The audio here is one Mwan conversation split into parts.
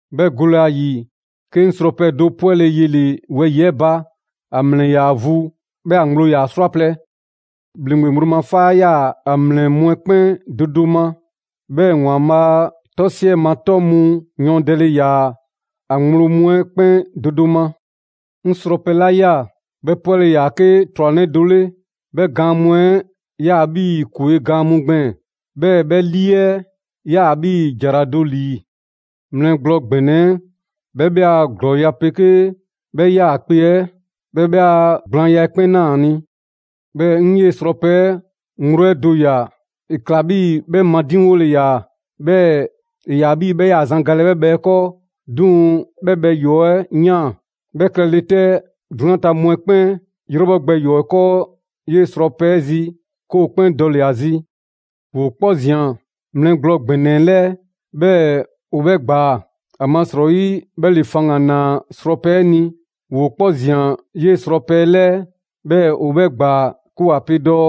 'Bhɛ gole ‑a ‑yi, 'ke 'ŋ srɔpɛ do 'pwɛle‑ yele‑ wɛyi‑ 'ɛ ba. ‑A ‑mlɛ ‑yaa vu, 'bhɛɛ‑ ‑a ŋgblo ‑yaa 'srwaplɛ‑. ‑Bhleŋgbe ŋgblo ma 'faa 'yaa‑ ‑a ‑mlɛ mu 'ɛ 'kpɛn do do ma. 'Bhɛɛ‑ ‑Waanbhaa' 'tɔ 'siɛ ma 'tɔ mu yɔɔndɛle ‑yaa ‑a ŋgblo mu 'ɛ 'kpɛn do do ma. 'Ŋ srɔpɛ 'la ꞊ya, 'bhɛ 'pwɛle‑ ‑yaa 'ke 'trwanɛ do 'le. 'Bhɛ gaan mu 'ɛ 'yaa‑ 'bhii‑ ‑kwe' gaan mu gbɛɛn‑; 'bhɛɛ‑ 'bhɛ 'lii 'ɛ 'yaa‑ 'bhii‑ ‑jara do ‑lii. Mlɛ gblɔ ‑gbɛnɛ 'ɛ 'bhɛ 'bhɛ a ‑glɔɔya' 'pegee 'bhɛ 'yaakpe‑ 'ɛ, 'bhɛɛ‑ 'bhɛ a gblaanya 'ɛ 'kpɛn ꞊naa ‑a ni. 'Bhɛɛ‑ 'ŋ 'yee‑ srɔpɛ 'ɛ ŋgblo 'ɛ do ꞊ya, ‑e ‑kla 'bhii‑ 'bhɛ madiŋwole ‑yaa, 'bhɛɛ‑ ‑e ‑yaa 'bhii‑ 'bhɛ 'yaa‑ zan galɛ 'bhɛ bhɛ 'ɛ 'kɔɔ. 'Duŋ‑ 'bhɛ bhɛ ‑yɔɔ' 'ɛ ꞊yaan. 'Bhɛ klɛle 'tɛ, 'drunyan ta mu 'ɛ 'kpɛn 'yrɛbhɔgbɛ ‑yɔɔ' 'kɔɔ 'yee‑ srɔpɛ 'ɛ zi, 'ke ‑o 'kpɛn dɔle‑ ‑a zi. ‑Woo 'kpɔ ꞊zian mlɛ gblɔ ‑gbɛnɛ 'ɛ 'lɛɛ, 'bhɛɛ‑ ‑o 'bhɛ ꞊gbaa, ‑amasrɔyi 'bhɛ ‑le faŋgan‑ ‑naa srɔpɛ 'ɛ ni. ‑Woo 'kpɔ ‑zian 'yee‑ srɔpɛ 'ɛ 'lɛɛ, 'bhɛɛ‑ ‑o 'bhɛ ‑gbaa, 'ke ‑wa pe dɔɔ: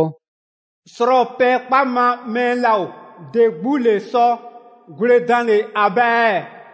«Srɔpɛ 'ɛ 'kpa ma mɛɛ 'laa ‑o! ‑De 'gbu ‑le sɔ gwledanle ‑a ba ɛɛ?»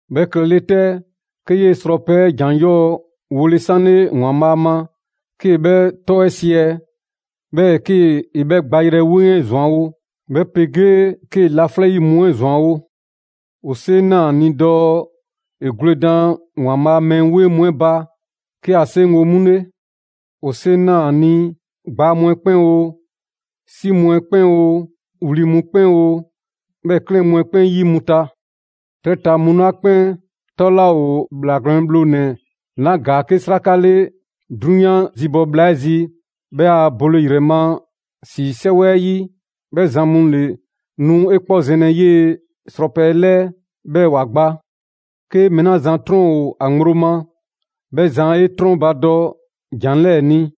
'Bhɛ klɛle 'tɛ, 'ke 'yee‑ srɔpɛ 'ɛ ‑jan 'yɔɔ‑ wole 'sanle ‑Waanbhaa' ma, 'kee‑ 'bhɛ 'tɔ 'ɛ 'siɛ‑, 'bhɛɛ‑ 'kee‑ 'bhɛ gbayrɛ 'weŋ 'ɛ ‑zwanwo', 'bhɛ 'pegee 'kee‑ laflɛ' 'yi mu 'ɛ ‑zwanwo'. ‑O 'seŋ ꞊naa ‑a ni dɔɔ ‑e gwledan ‑Waanbhaa' a mɛɛ 'weŋ mu 'ɛ ba, 'ke ‑a 'seŋgo‑ 'mu 'le. ‑O 'seŋ ꞊naa ‑a ni ‑gbaa mu 'ɛ 'kpɛn oo, 'si mu 'ɛ 'kpɛn oo, wli mu 'kpɛn oo, 'bhɛɛ‑ 'klɛɛn mu 'ɛ 'kpɛn 'yi mu ta. 'Trɛ ta mu 'la 'kpɛn 'tɔ 'laa ‑o ‑Bhlaa Gwlɛn Bhlonɛ‑ 'la ‑gaa 'ke 'sraka 'le 'drunyan zibɔ bhla 'ɛ zi 'bhɛ a bole ‑yrɛ ma ‑si 'sɛwɛ 'ɛ 'yi, 'bhɛ zan mu ‑le nu 'e 'kpɔ zɛnlɛ 'yee‑ srɔpɛ 'ɛ 'lɛɛ, 'bhɛɛ‑ ‑wa gba. «'Ke mɛɛ 'la zan 'trɔn ‑o ‑a ŋgblo ma, 'bhɛ zan 'e 'trɔnbadɔ ‑jan 'lɛɛ‑ ni.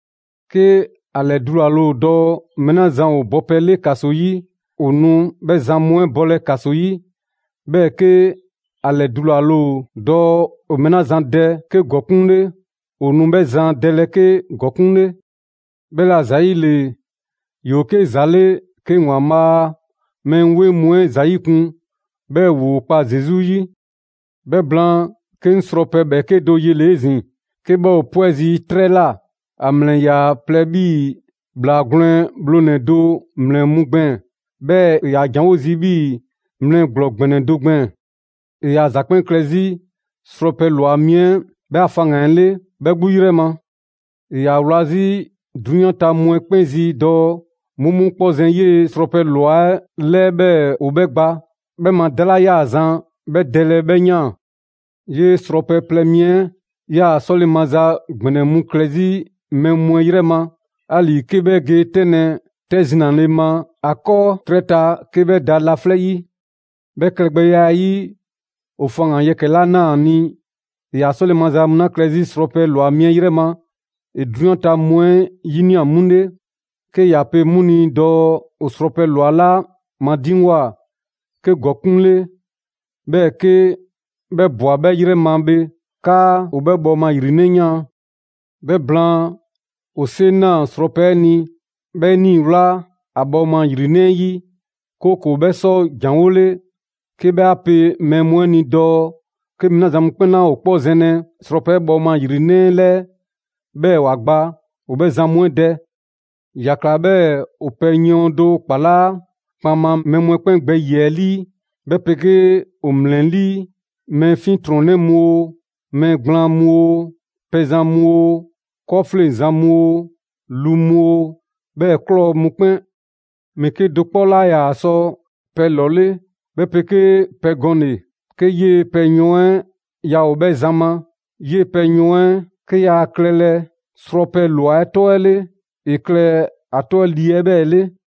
'Ke ‑a ‑lɛdulale ‑o dɔɔ mɛɛ 'la zan ‑o bɔpɛ 'le ‑kaso 'yi, ‑o nu 'bhɛ zan 'ɛ bɔlɛ ‑kaso 'yi. 'Bhɛɛ‑ 'ke ‑a ‑lɛdulale ‑o dɔɔ ‑o mɛɛ 'la zan dɛ 'ke ‑gɔkuŋ' 'le, ‑o nu 'bhɛɛ‑ zan dɛlɛ 'ke ‑gɔkuŋ' 'le. 'Bhɛla‑ ‑zayile, ‑yoo 'ke ‑za 'le 'ke ‑Waanbhaa' a mɛɛ 'weŋ mu 'ɛ ‑o ‑za 'yikun‑, 'bhɛɛ‑ ‑woo kpa Zesu 'yi.» 'Bhɛ blaan, 'ke 'ŋ srɔpɛ ‑bhɛɛke' do yele‑ 'ezin‑ 'ke 'bhɛ ‑o 'pwɛ zii' 'trɛ ꞊la. ‑A ‑mlɛ ‑yaa plɛ 'bhii‑ ‑bhlaa gwlɛn bhlonɛ‑ do ‑mlɛ mu gbɛɛn‑, 'bhɛɛ‑ ‑e ‑yaa ‑janwo' zii' 'bhii‑ mlɛ gblɔ ‑gbɛnɛ do gbɛɛn‑. ‑E ‑yaa ‑za 'kpɛn klɛ 'zi srɔpɛ ‑lwa mi 'ɛ 'bhɛ a faŋgan‑ 'ɛ 'le 'bhɛ 'gbu 'yrɛ ma. ‑E ‑yaa a wla 'zi 'drunyan ta mu 'ɛ 'kpɛn zi dɔɔ 'mu 'mu 'kpɔ zɛn 'yee‑ Srɔpɛ ꞊lwa 'ɛ 'lɛɛ 'bhɛɛ‑ ‑o 'bhɛ gba. 'Bhɛ ma 'da 'la 'yaa‑ zan 'bhɛ dɛlɛ 'bhɛ ꞊yaan. 'Yee‑ Srɔpɛ plɛ mi 'ɛ 'yaa‑ 'sɔle‑ maza ‑gbɛnɛ mu klɛ 'zi mɛɛ mu 'ɛ 'yrɛ ma, 'ali‑ 'ke 'bhɛ ge 'tɛnlɛ‑ 'tɛ zinale ma ‑a 'kɔɔ 'trɛ ta 'ke 'bhɛ da laflɛ' 'yi. 'Bhɛ klɛgbɛya 'ɛ 'yi, ‑o faŋgan‑ yɛkɛ‑ 'la ꞊naa ‑a ni, ‑e ‑yaa 'sɔle‑ maza mu 'la klɛ 'zi srɔpɛ ꞊lwa 'ɛ 'yrɛ ma, ‑e 'drunyan ta mu 'ɛ 'yinia‑ 'mu 'le, 'ke ‑ya pe 'mu ni dɔɔ ‑o srɔpɛ ꞊lwa 'la madiŋgwa 'ke ‑gɔkuŋ' 'le, 'bhɛɛ‑ 'ke 'bhɛ ꞊bwa 'bhɛ ‑yrɛ ma bhe, 'kaa ‑o 'bhɛ bhɔɔma ‑yrinɛ' ꞊yaan. 'Bhɛ blaan, ‑o 'seŋ ꞊naa srɔpɛ 'ɛ ni, 'bhɛɛ‑ ‑e nii‑ ‑wlaa ‑a bhɔɔma ‑yrinɛ' 'ɛ 'yi, 'kooko‑ 'bhɛ sɔ ‑janwole 'ke 'bhɛ 'a pe mɛɛ mu ni dɔɔ 'ke mɛɛ 'la zan mu 'kpɛn 'laa ‑o 'kpɔ zɛnlɛ srɔpɛ 'ɛ bhɔɔma ‑yrinɛ' 'ɛ 'lɛɛ 'bhɛɛ‑ ‑wa gba, ‑o 'bhɛ zan mu 'ɛ dɛ. ‑Ya ꞊kla 'bhɛɛ‑ ‑o pɛ yɔɔn do kpalaa' kpaŋma mɛɛ mu 'ɛ 'kpɛn gbɛ ‑yiɛ' ‑lii, 'bhɛ 'pegee ‑o ‑mlɛlii': mɛɛ 'fiɛntrɔnnɛ mu oo, mɛɛ gblaan mu oo, pɛzan mu oo, 'kɔɔfleŋzan mu oo, lu mu oo, 'bhɛɛ‑ ꞊klɔ mu 'kpɛn. Mɛɛ 'kedo‑ 'kpɔ 'laa ‑yaa sɔ pɛ ‑lɔle', 'bhɛ 'pegee pɛ gɔnle‑, 'ke 'yee‑ pɛ yɔɔn 'ɛ yaa ‑o 'bhɛ zan ma: 'yee‑ pɛ yɔɔn 'ɛ 'ke yaa klɛlɛ srɔpɛ ꞊lwa 'ɛ 'tɔ 'ɛ 'le, ‑e klɛ ‑a 'tɔ 'ɛ 'lii 'ɛ 'bhɛɛ‑ 'le.